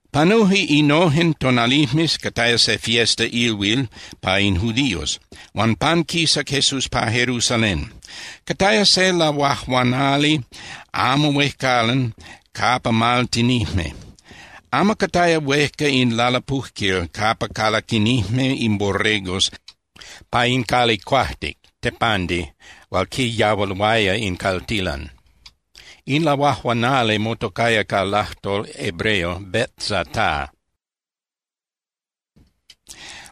Panuje innojen tonalijmes, cataya se fiesta (ilhuil) pa in judíos, huan panquisac Jesús pa Jerusalén. Cataya se lahuajuanali amo huejcalan capa maltinijme. Amo cataya huejca in lalapujquil capa calaquinijme in borregos pa in cali cuajtic (tepandi) hual quiyahualuaya in caltilan. In lahuajuanali motocaya ca lajtol hebreo Betzata,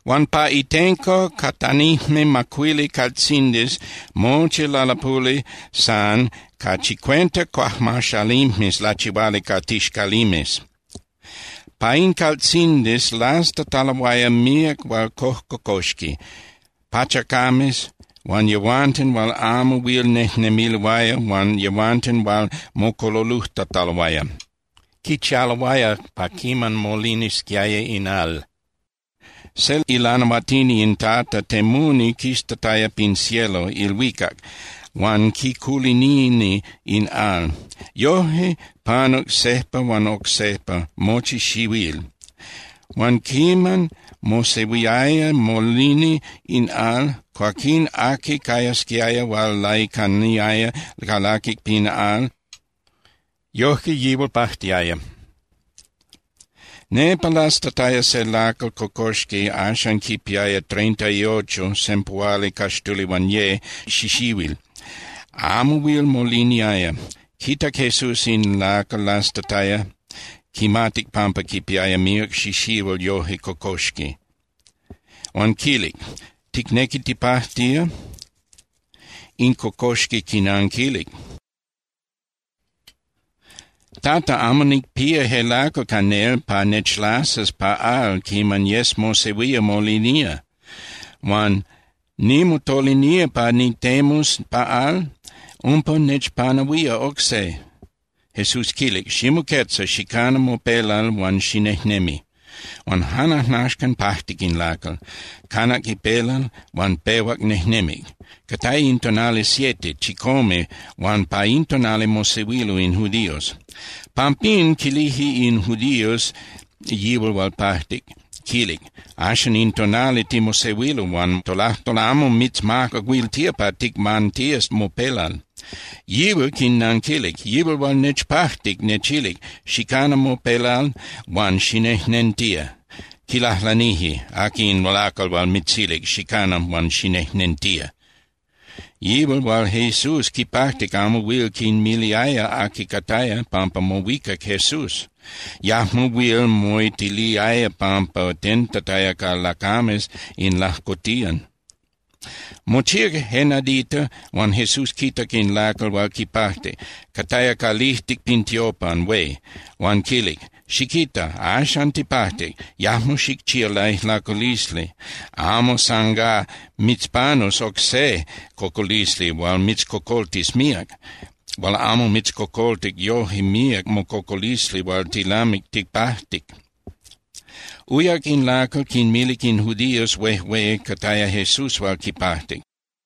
huan pa itenco catanijme macuili caltzindis mochi lalapuli san ca chicuenta cuajmaxalimes lachihuali ca tixcalimes. Pa in caltzindis lastataloaya míac hual cojcocoxqui, pachacames huan yehuanten hual amo huil nejnemiloaya huan yehuanten hual mocololojtataloaya. Quichialoaya pa quiman molinisquiaya in al. Se ilanahuatini in Tata temuni quistataya pin cielo (ilhuicac) huan quiculinini in al, yoje panuc sejpa huan oc sejpa mochi xihuil. Huan quiman mosehuiaya molini in al, cuaquín aqui cayasquiaya hual laicaniaya calaqui pa al, yojque yihual pajtiaya. Nepa lastataya se lacal cocoxqui, axan quipiaya treinta y ocho (sempuhualicaxtulihuanye) xixihuil amo huil moliniaya. Quitac Jesús in lacal lastataya, quimatic pampa quipiaya míac xixihuil yoje cocoxqui. Huan quilic: —¿Ticnequi tipajtía? In cocoxqui quinanquilic: —Tata, amo nicpía je lacal ca nel pa nechlasas pa al quiman yes mosehuía molinía. Huan nimotolinía pa nitemus pa al, umpa nechpanahuía oc se. Jesús quilic: —Ximoquetza, xicana mopelal huan xinejnemi. Huan jan ajnaxcan pajtic in lacal, canac ipelal huan pehuac nejnemic. Cataya in tonali siete (chicome) huan pa in tonali mosehuilo in judíos. Pampín quilije in judíos yihual hual pajtic, quil: —Axan in tonali timosehuilo, huan tolajtol amo mitzmacahuiltía pa ticmantías mopelal. Yihual quinnanquilic: —Yihual hual nechpajtic nechilic: “Xicana mopelal huan xinejnentía.” Quilajlanije: —¿Aqui in lacal hual mitzilic: “Xicana huan xinejnentía”? Yihual hual Jesús quipajtic amo huil quinmiliaya aqui cataya, pampa mohuicac Jesús, yajmo huil moitiliaya pampa tentataya ca lacames in lajcotiyan. Mochíac je nadita huan Jesús quitac in lacal hual quipajtic, cataya calijtic pin tiopan hué, huan quilic: —Xiquita. Axan tipajtic. Yajmo xicchía laijlaculisli amo san gá mitzpanus oc se cocolisli hual mitzcocoltis míac, hual amo mitzcocoltic yoje míac mococolisli hual tilamic tipajtic. Uyac in lacal, quinmilic in judíos huejué cataya Jesús hual quipajtic.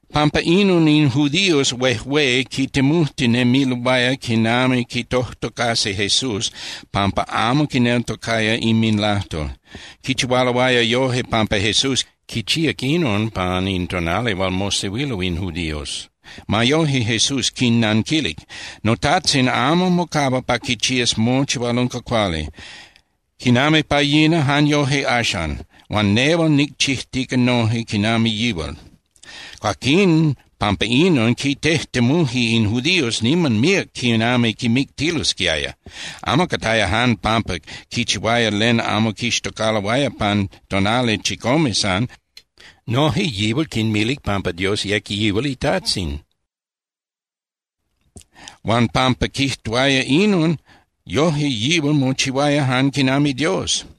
Pampa inon in judíos huejué quitemujtinemiloaya quinami quitojtocasi Jesús pampa amo quineltocaya inminlajtol. Quichihualoaya yoje pampa Jesús quichíac inon pan in tonali hual mosehuilo in judíos. Ma yoje, Jesús quinnanquilic: —NoTajtzin amo mocahua pa quichías mochi hual unca cuali. Quinami pa yina, jan yoje axan. Huan nehual nicchijtica noje quinami yihual. Cuaquín pampa inon, quitejtemuje in judíos niman míac quinami quimictilosquiaya. Amo cataya jan pampa quichihuaya len amo quixtocaloaya pan tonali chicome san. Noje yihual quinmilic pampa Dios yec yihual iTajtzin. Huan pampa quijtuaya inon, yoje yihual mochihuaya jan quinami Dios.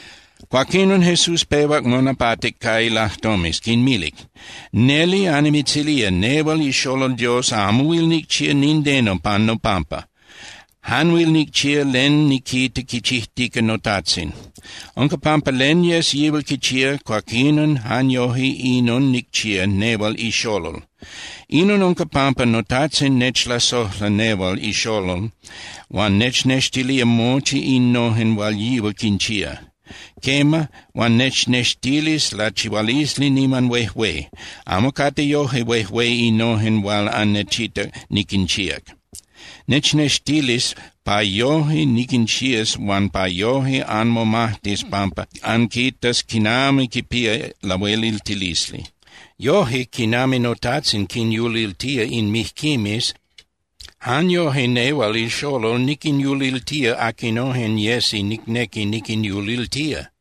Cuaquinon, Jesús pehuac monapatic ca ilajtomes, quinmilic: —Neli annimitzilía, nehual iXolol Dios amo huil nicchía nindeno pan nopampa. Jan huil nicchía len niquita quichijtica noTajtzin. Unca pampa len yes yihual quichía, cuaquinon jan yoje inon nicchía nehual iXolol. Inon unca pampa noTajtzin nechlasojla nehual iXolol, huan nechnextilía mochi innojen hual yihual quinchía. Quema, huan nechnextilis lachihualisli niman huejué. Amo cate yoje huejué innojen hual annechitac niquinchíac. Nechnextilis pa yoje niquinchías huan pa yoje anmomajtis pampa anquitas quinami quipía lahueliltilisli. Yoje, quinami noTajtzin quinyuliltía in mijquimes, jan yoje nehual iXolol niquinyuliltía aquinojen yesi nicnequi niquinyuliltía.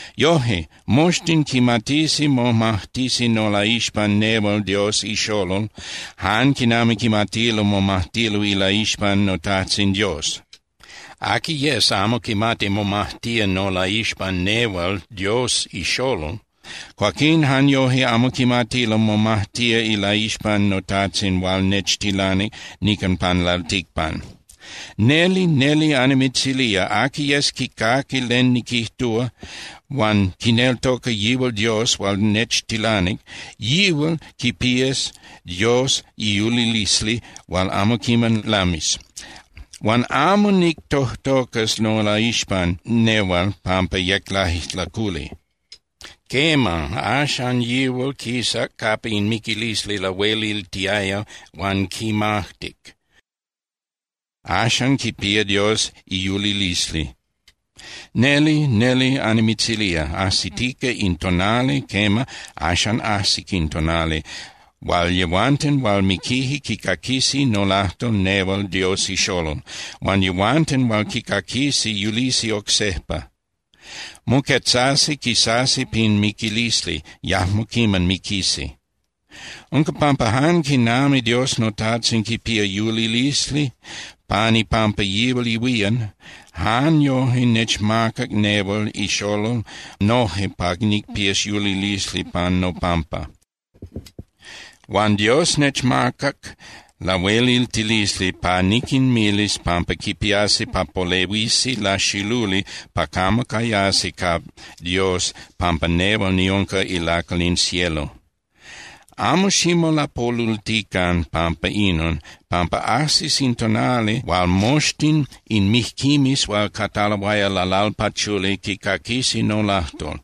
Yoje, moxtin quimatisi momajtisi nolaixpan nehual Dios iXolol jan quinami quimatilo momajtilo ilaixpan noTajtzin Dios. Aqui yes amo quimati momajtía nolaixpan nehual Dios iXolol, cuaquín jan yoje amo quimati momajtía ilaixpan noTajtzin hual nechtilanic nican pan lalticpan. ’Neli, neli annimitzilía, aqui yes quicaqui len niquijtúa huan quineltoca yihual Dios hual nechtilanic, yihual quipía Dios iyulilisli hual amo quiman lamis. Huan amo nictojtocas nolaixpan nehual pampa yec laijlaculi. Quema, axan yihual quisac capa in miquilisli lahueliltiaya huan quimajtic, axan quipía Dios iyulilisli. Neli, neli annimitzilía, ajsitica in tonali, quema, axan ajsic in tonali hual yehuanten hual miquije quicaquisi nolajtol nehual Dios iXolol, huan yehuanten hual quicaquisi yulisi oc sejpa. Moquetzasi, quisasi pin miquilisli, yajmo quiman miquisi. Unca pampa jan quinami Dios noTajtzin quipía yulilisli pan ipampa yihual ihuían, jan yoje nechmacac nehual iXolol noje pa nicpías yulilisli pan nopampa. Huan Dios nechmacac lahueliltilisli pa niquinmilis pampa quipiasi pa polehuisi laxiluli pa camo cayasi ca Dios pampa nehual niunca ilacal in cielo. Amo ximolapolultican pampa inon, pampa ajsis in tonali hual moxtin in mijquimes hual cataloaya lalalpachuli quicaquisi nolajtol.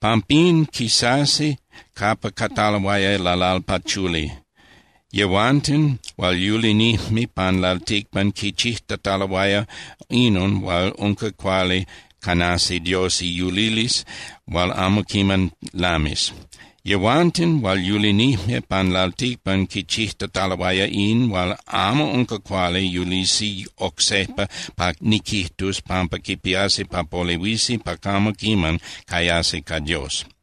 Pampín, quisasi capa cataloaya lalalpachuli. Yehuanten hual yulinijme pan lalticpan quichijtataloaya inon hual unca cuali canasi Dios iyulilisli hual amo quiman lamis. Yehuanten hual yulinijme pan lalticpan quichijtataloaya in hual amo unca cuali yulisi oc sejpa pa niquijtus pampa quipiasi pa polehuisi pa camo quiman cayasi ca Dios.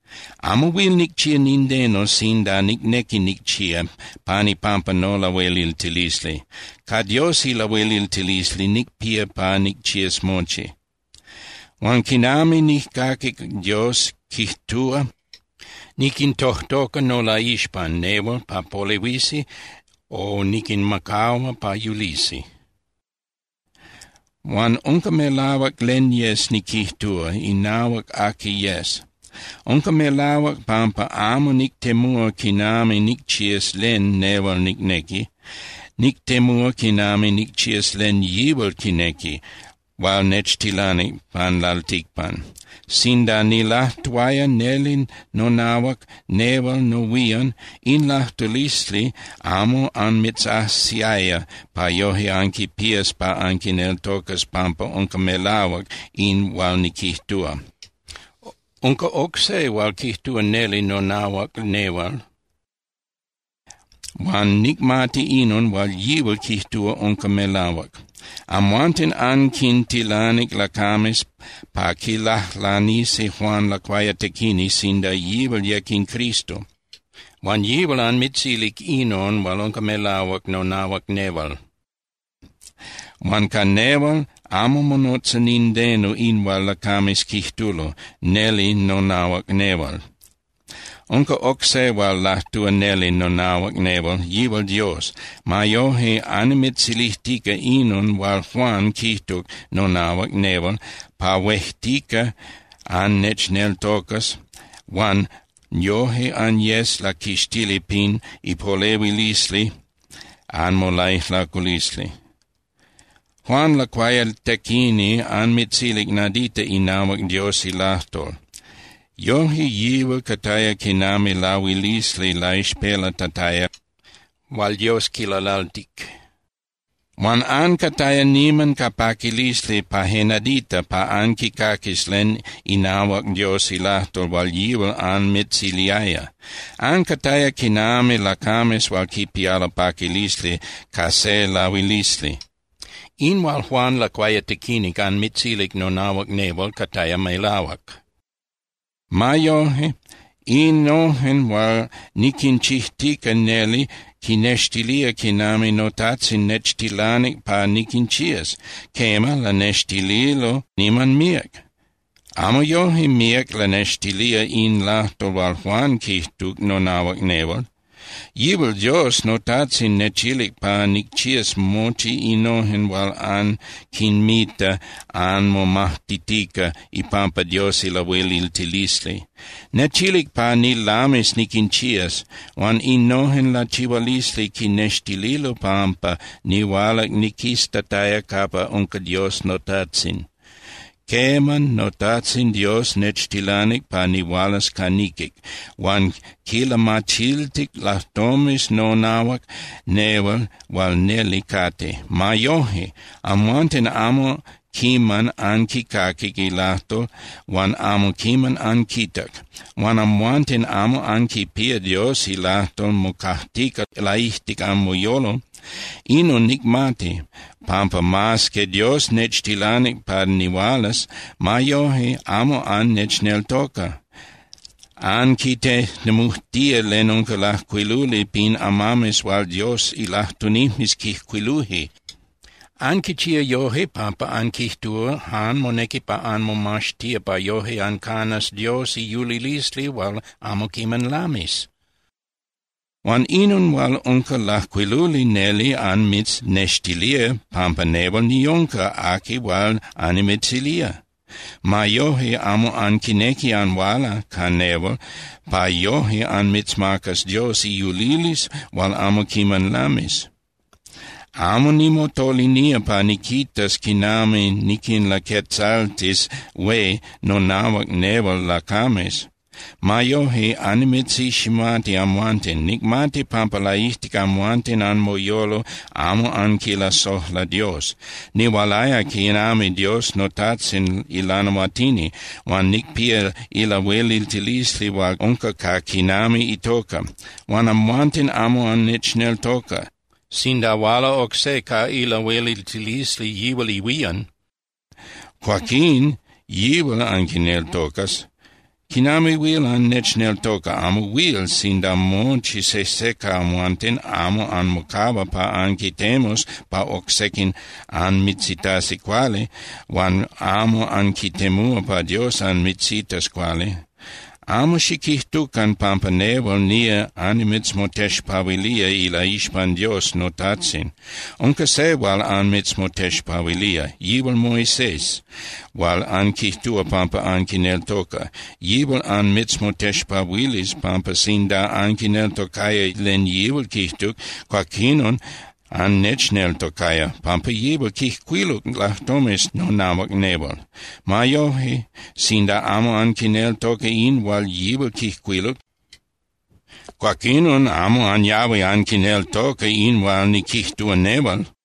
’Amo huil nicchía nindeno sinda nicnequi nicchía pan ipampa nolahueliltilisli. Ca Dios ilahueliltilisli nicpía pa nicchías mochi. Huan quinami nijcaqui Dios quijtúa, niquintojtoca nolaixpan nehual pa polehuisi o niquinmacahua pa yulisi. Huan unca melahuac len yes niquijtúa inahuac aqui yes. Unca melahuac pampa amo nictemúa quinami nicchías len nehual nicnequi. Nictemúa quinami nicchías len yihual quinequi hual nechtilanic pan lalticpan. Sinda nilajtuaya neli nonahuac nehual nohuían, in lajtulisli amo anmitzajsiaya pa yoje anquipías pa anquineltocas pampa unca melahuac in hual niquijtúa. Unca oc se hual quijtúa neli nonahuac nehual, huan nicmati inon hual yihual quijtúa unca melahuac. Amhuanten anquintilanic lacames pa quilajlanisi Juan Lacuayatequini sinda yihual yec in Cristo, huan yihual anmitzilic inon hual unca melahuac nonahuac nehual. Huan ca nehual amo monotza nindeno in hual lacames quijtulo neli nonahuac nehual. Unca oc se hual lajtúa neli nonahuac nehual, yihual Dios. Ma yoje, annimitzilijtica inon hual Juan quijtuc nonahuac nehual, pa huejtica annechneltocas huan yoje anyes laquixtili pin ipolehuilisli anmolaijlaculisli. Juan Lacuayatequini anmitzilic nadita inahuac Dios ilajtol. Yoje yihual cataya quinami lahuilisli laixpelatataya hual Dios quilalaltic. Huan ancataya niman ca paquilisli pa je nadita pa anquicaquis len inahuac Dios ilajtol hual yihual anmitziliaya. Ancataya quinami lacames hual quipialo paquilisli ca se lahuilisli. In hual Juan Lacuayatequini anmitzilic nonahuac nehual cataya melahuac. Ma yoje, innojen hual niquinchijtica neli quinextilía quinami noTajtzin nechtilanic pa niquinchías. Quema, lanextililo niman míac. Amo yoje míac lanextilía in lajtol hual Juan quijtuc nonahuac nehual. Yihual Dios noTajtzin nechilic pa nicchías mochi innojen hual anquinmita anmomajtitica ipampa Dios ilahueliltilisli. Nechilic pa nilamis niquinchías, huan innojen lachihualisli quinextililo pampa nihualac niquistataya capa unca Dios noTajtzin. Quema, noTajtzin Dios nechtilanic pa nihualas ca niquic, huan quilamachiltic lajtomes nonahuac nehual hual neli cate. Ma yoje, amhuanten amo quiman anquicaquic ilajtol huan amo quiman anquitac. Huan amhuanten amo anquipía Dios ilajtol mocajtica laijtic anmoyolo. Inon nicmati, pampa mas que Dios nechtilanic pa nihualas, ma yoje amo annechneltoca. Anquitejtemujtía len unca lajcuiluli pin amames hual Dios ilajtunijmes quijcuiluje. Anquichía yoje pampa anquijtúa jan monequi pa anmomaxtía pa yoje ancanas Dios iyulilisli hual amo quiman lamis. Huan inon hual unca lajcuiluli neli anmitznextilía pampa nehual niunca aqui hual annimitzilía. Ma yoje, amo anquinequi anhuala ca nehual pa yoje anmitzmacas Dios iyulilisli hual amo quiman lamis. ’Amo nimotolinía pa niquitas quinami niquinlaquetzaltis hué nonahuac nehual lacames. Ma yoje, annimitziximati amhuanten, nicmati pampa laijtic amhuanten anmoyolo amo anquilasojla Dios. Nihualaya quinami Dios noTajtzin ilanahuatini, huan nicpía ilahueliltilisli hual unca ca quinami itoca. Huan amhuanten amo annechneltoca. Sinda huala oc se ca ilahueliltilisli yihual ihuían, cuaquín yihual anquineltocas. ¿Quinami huil annechneltoca? Amo huil, sinda mochi sejse ca amhuanten amo anmocahua pa anquitemus pa oc sequin anmitzitasi cuali huan amo anquitemúa pa Dios anmitzitas cuali. Amo xiquijtucan pampa nehual nía annimitzmotexpahuilía ilaixpan Dios noTajtzin. Unca se hual anmitzmotexpahuilía. Yihual Moisés hual anquijtúa pampa anquineltoca. Yihual anmitzmotexpahuilis pampa sinda anquineltocaya len yihual quijtuc, cuaquinon annechneltocaya, pampa yihual quijcuiluc lajtomes nonahuac nehual. Ma yoje, sinda amo anquineltoca in hual yihual quijcuiluc, cuaquinon amo anyahui anquineltoca in hual niquijtúa nehual.